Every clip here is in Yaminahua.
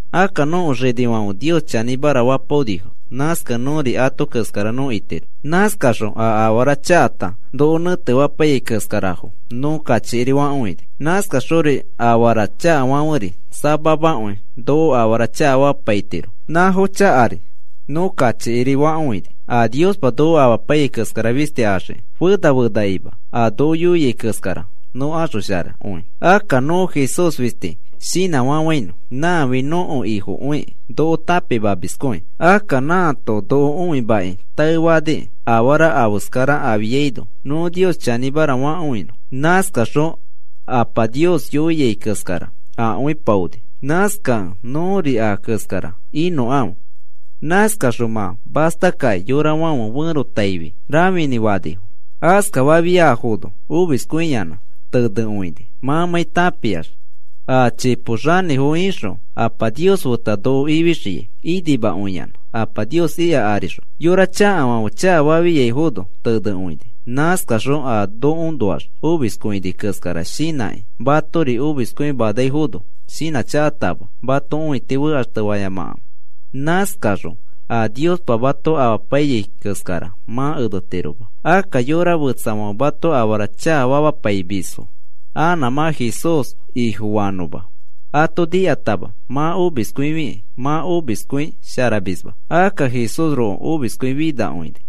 Akka nõko xinifãfe Nios chanĩmara fapaonifo. Nãskakẽ nõri ato keskara nõ itiro. Nãskaxõ a afara chakata noko nẽtefapaiyai keskara nãfo nõ kachikiri fakõini. Nãskaxori afara chakafãferi samamakõi noko afara chakafamapaitiro. Nãfo chakari nõ kachikiri fakõini a Niospa noko amapaiyai keskara fisti axiki, fena fenakima a noko yoiai keskara nõ axosharakõi. Akka nõ Jesús fisti shinãfafãinõ. Nãfi nõko Ifokõikĩ noko tãpimamiskõi. Akka nãato noko õimakĩ taefanikĩ afara afeskara afiaino nõ Nios chanĩmara fakõinõ. Nãskaxõ a Apa yoia keskara akõipaoni. Nãskakẽ nõri a keskara inõkãfe. Nãskaxõ mã mastakakĩ yorafãfe ferotaifi rãfinĩ fanifo. Askafafiaifono omiskõiyanã tenekõini mãmãi tãpiax a chipo xanĩfo ixõ Apa Nios feta noko ifixiai inimakõiyanã Apa Nios ika arixõ. Yora chakafãfe chakafafiaifono tenekõini. Nãskaxõ a nokoõnoax omiskõini keskara shinãkĩ matori omiskõimanaifono, shinãchakatama mãto õiti fekaxtefayamakãfe. Nãskaxõ a Niospa mato amapaiyai keskara mã enetiroma. Akka yorafetsafãfe mato afara chakafamapaimisfo anã mã Jesús Ifofanõma, ato nikatama mã omiskõifi mã omiskõi sharamisma. Akka Jesúsroko omiskõi finakõini.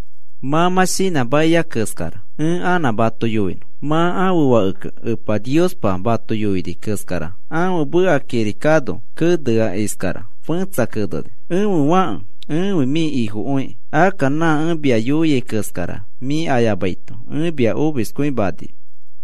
Mã mã shinãmakia keskara ẽ anã mato yoinõ. Mã ãfe fakekẽ, Epa Niospa mato yoini keskara ãfe meka kirikano kenea iskara fẽtsa keneni: Ẽfe fãke, ẽfi mĩ Ifokõikĩ. Akka nã ẽ mia yoiai keskara mĩ ayamaito ẽ mia omiskõimani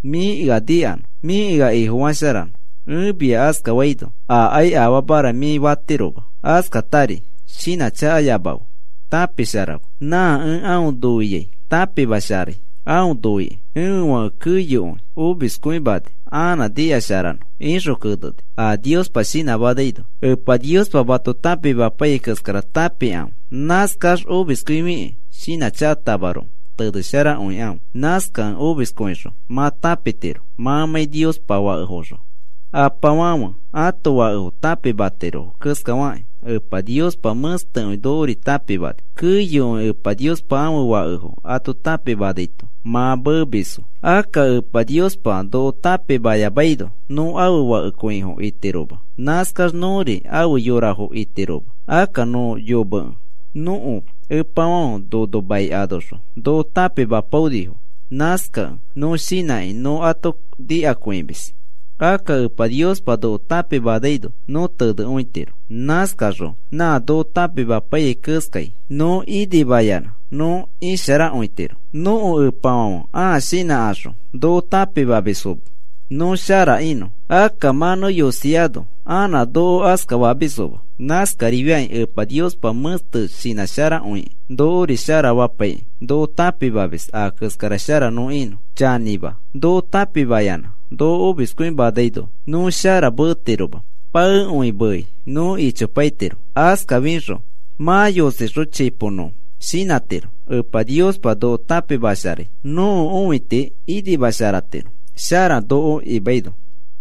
mĩ ea nikanõ, mĩ ea Ifofasharanõ. Ẽ mia askafaino, akai afamara mĩ fatiroma. Askatari shinãchakayamafe. Tãpisharafe. Nã ẽ aõ noiai tãpimasharai aõ noikĩ. Ẽfe fake keyokõi omiskõimani anã nikasharanõ, ixõ keneni a Niospa shinãmanaino. Epa Niospa mato tãpimapaiyai keskara tãpikãfe. Nãskax omiskõifikĩ shinãchakatamaroko tenesharakõikãfe. Nãskakẽ omiskõixõ mã tãpitiro mãmãi Niospa fakefoxõ. Apafãfe ãto fakefo tãpimatirofo keskafakĩ Epa Niospa mẽstekõi nokori tãpimani. Keyokõi Epa Niospa ãfe fakefo ato tãpimanaito mã meemisfo. Akka Epa Niospa noko tãpimayamaino nõ ãfe fakekõifo itiroma. Nãskax nõri ãfe yorafo itiroma. Akka nõ yomekẽ nõko epafãfe nono mai anoxõ noko tãpimapaonifo. Nãskakẽ nõ shinãkĩ nõ ato nikakõimis. Akka Epa Niospa noko tãpimanaino nõ tenekõitiro. Nãskaxõ nã noko tãpimapaiyai keskai nõ inimayanã nõ isharakõitiro. Nõko epafãfe ãa shinãkaxõ noko tãpimamisfo nõ shara inõ. Akka mã nõ yosiano anã noko askafamisfoma. Nãskarifakĩ Epa Niospa mẽste shinãsharakõikĩ, nokori shara fapaikĩ noko tãpimamis a keskara shara nõ inõ. Chanĩma, noko tãpimayanã noko omiskõimanaino nõ shara meetiroma. Paekõi mei nõ ichopaitiro. Askafixõ mã yosixõ chipo nõ shinãtiro Epa Niospa noko tãpimasharai, nõko õiti inimasharatiro shara noko imaino.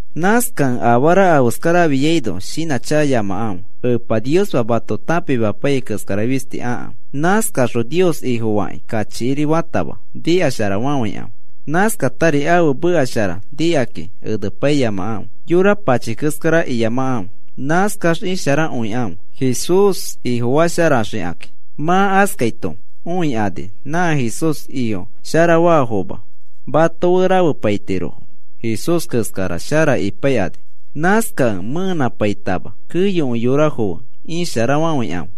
Nãskakẽ afara afeskara afiaino shinãchakayamakãfe. Epa Niospa mato tãpimapaiyai keskara fisti akãfe. Nãskaxõ Nios Ifofakĩ kachikiri fatama nikasharafafãikãfe. Nãskatari ãfe meka shara nikakĩ enepaiyamakãfe. Yora pachi keskara iyamakãfe. Nãskax isharakõikãfe Jesús Ifofasharaxikakĩ. Mã askaito õikani nã Jesús Ifo sharafaafoma mato fe rafepaitirofo Jesús keskara shara ipaikani. Nãskakẽ mẽenãpaitama keyokõi yorafo fe isharafafãikãfe.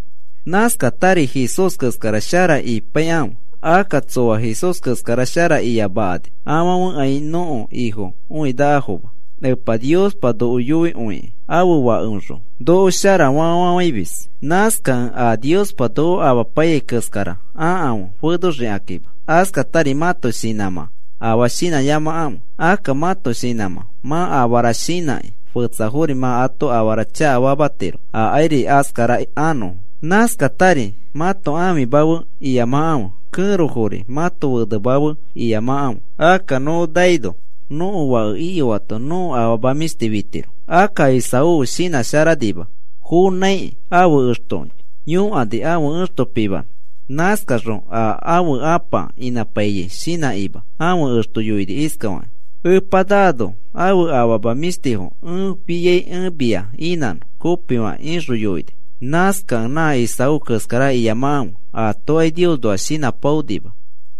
Nãskatari Jesús keskara shara ipaikãfe. Akka tsoa Jesús keskara shara iyamakani afãfekai nõko Ifo õinakafoma. Epa Niospa noko noikõikĩ ãfe Fakeoxõ noko sharafa fafafãimis. Nãskakẽ a Niospa noko amapaiyai keskara akãfe fenoxikakima. Askatari mãto shinãmã afaa shinãyamakãfe. Akka mãto shinãmã mã afara shinãkĩ fetsafori mã ato afara chakafamatiro akairi askara anõfo. Nãskatari mãto ãfima fe iyamakãfe. Kẽrofori mãto fenema fe iyamakãfe. Akka nõ naino, nõko fake iyoato nõko afama mĩshti fitiro. Akka Esaú shinãsharanima. Fonãikĩ ãfe exto yõkani ãfe ẽxto pimanõ. Nãskaxõ a ãfe apa inãpaiyai shinãkima ãfe exto yoini iskafakĩ: “Epa naano ãfe afama mĩshtifo ẽ fiai ẽ mia inãnõ kopifakĩ,” ixõ yoini. Nãskakẽ nã Esaú keskara iyamakãfe. Atokai Niosnoa shinãpaonima.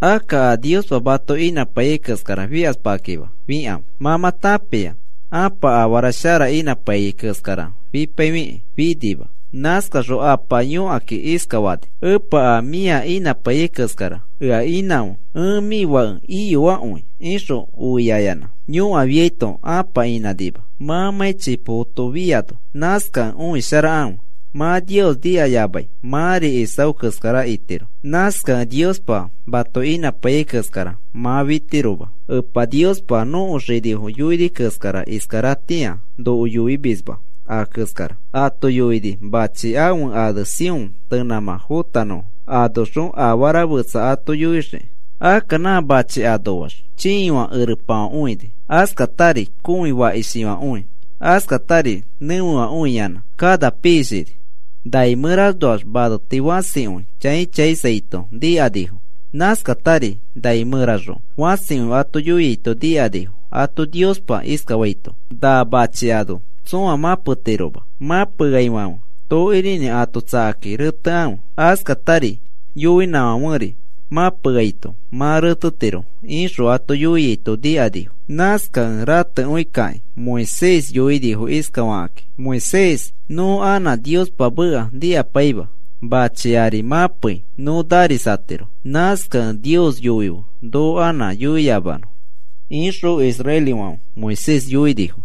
Akka a Niospa mato inãpaiyai keskara fikaspakĩma, fikãfe. Mã mã tãpia ãpa afara shara inãpaiyai keskara fipaifikĩ finima. Nãskaxõ apa yõkakĩ iskafani: “Epa, a mĩa inãpai keskara ea inãfe, ẽ mĩ fake iyoakõi,” ixõ oiaiyanã yõkafiaito ãpa inãnima mãmãi chipokoto fiano. Nãskakẽ õisharakãfe. Mã Nios nikayamai mãri Esaú keskara itiro. Nãskakẽ Niospa mato inãpaiyai keskara mã fitiroma. Epa Niospa a nõko xinifo yoini keskara iskaratĩa noko yoimisma a keskara. Ato yoini machi ãfe ane Sión tenãmã fotanõfo anoxõ afara fetsa ato yoixiki. Akka nã machi anoax chiifã erepafãkõi, askatari kõi fakishifãkõi, askatari nẽfefãkõiyanã kana piishini. Nai mẽranoax maneti fãsikõi chãi chãisaito nikanifo. Nãskatari nai mẽraxõ fãsikõi ato yoiaito nikanifo ato Niospa iskafaito: “Na machi ano tsõa mãpetiroma. Mãpeaifãfe tokirinĩ ato tsakakĩ retekãfe. Askatari yoinãfãferi mãpeaito mã retetiro,” ixõ ato yoiaito nikanifo. Nãskakẽ ratekõikakĩ Moisés yoinifo iskafakakĩ: “Moisés, nõ anã Niospa meka nikapaima. Mãchi ari mãpei nõ narisatiro. Nãskakẽ Nios yoife noko anã yoiyamanõ,” ixõ israelifãfe Moisés yoinifo.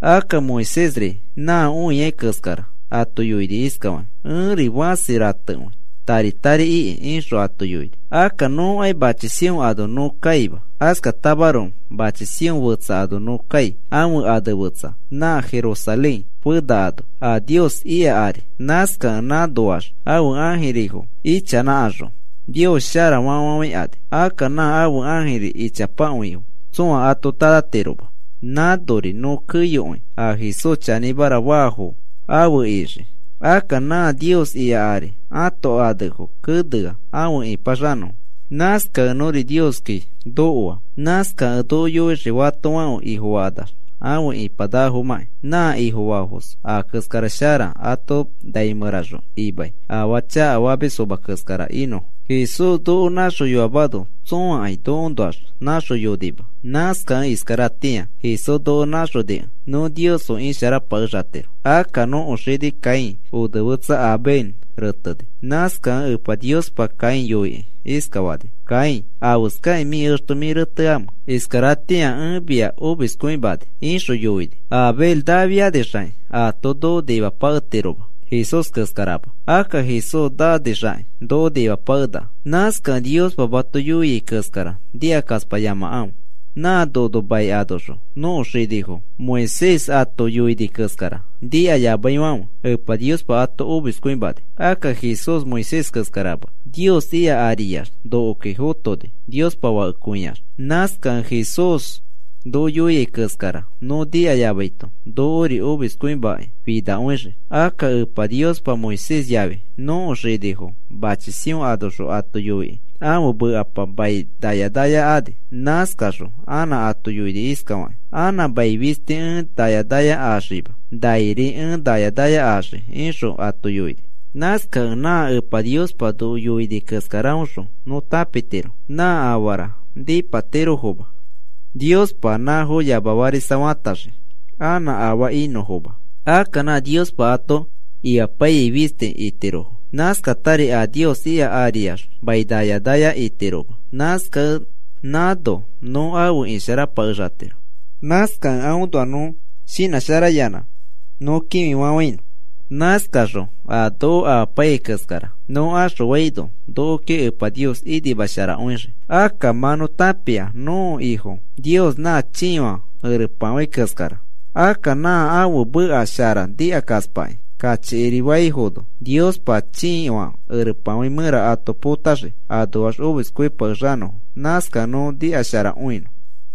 Akka Moisésri nã õia keskara ato yoini iskafakĩ: “Ẽri fãsi ratekõi, tari tari iki,” ixõ ato yoini. Akka nõkai machi Sión ano nõ kaima. Askatamaroko machi Sión fetsa ano nõ kai, ãfe ane fetsa nã Jerusalén Fena ano a Nios ika ari. Nãskakẽ nãnoax ãfe ãjirifo ichanãkaxõ, “Nios sharara,” fafafafãikani. Akka nã ãfe ãjiri ichapakõifo tsõa ato tanãtiroma. Nãnori nõ keyokõi a Jesús chanĩmara faafo afe ixii. Akka nã Nios ika ari ãto anefo kenea afe ĩpaxanõfo. Nãskakẽ nõri nõ Nioski nokoa. Nãskakẽ noko yoixii fatofãfe Ifofakanax afe ipanakafomãki. Nã Ifofaafos a keskara shara ato nai mẽraxõ imai afaa chakafamisfoma keskara inõfo. Jesús noko nãxoyoamano tsõakai nokoõnoax nãxoyonima. Nãskakẽ iskaratĩa Jesús noko nãxonikẽ nõ Nios fe isharapakexatiro. Akka nõko xini Caín onefetsa Abel reteni. Nãskakẽ Epa Niospa Caín yoikĩ iskafani: “Caín, ¿afeskakĩ mĩ exto mĩ reteamẽ? Iskaratĩa ẽ mia omiskõimani,” ixõ yoini. Abel nafianixakĩ aato noko nimapaketiroma, Jesús keskarama. Akka Jesús nanixakĩ noko nimapakenaka. Nãskakẽ Niospa mato yoiai keskara nikakaspayamakãfe. Nã nono mai anoxõ nõko xinifo Moisés ato yoini keskara nikayamaifãfe Epa Niospa ato omiskõimani. Akka Jesús Moisés keskarama. Nios ika ariax nokoki fotoni Niospa Fakekõiax. Nãskakẽ a Jesús noko yoiai keskara nõ nikayamaito nokori omiskõimakĩ finakõixii. Akka Epa Niospa Moisés yafi nõko xinifo machi Sión anoxõ ato yoikĩ ãfe mekapa mai naya naya ani. Nãskaxõ anã ato yoini iskafakĩ: “Anã mai fisti ẽ naya naya axima. Nairi ẽ naya naya axii,” ixõ ato yoini. Nãskakẽ nã Epa Niospa noko yoini keskaraõxõ nõ tãpitiro nã afara nipatirofoma, Niospa nãfo yamafarisafataxii anã afaa inõfoma. Akka nã Niospa ato imapaiyai fisti itirofo. Nãskatari a Nios ika ariax mai naya naya itiroma. Nãskakẽ nãno nõ afe isharapakexatiro. Nãskakẽ aõnoa nõ shinãsharayanã nõ kĩfifafãinõ. Nãskaxõ a noko amapaiyai keskara nõ axõaino nokoki Epa Nios inima sharakõixii. Akka mã nõ tãpia nõko Ifo Nios nã chiifã erepafãi keskara. Akka nã ãfe meka shara nikakaspakĩ kachikiri faifono Niospa chiifã erepafãi mẽra ato potaxii anoax omiskõipakexanõfo. Nãskakẽ nõ nikasharakõinõ.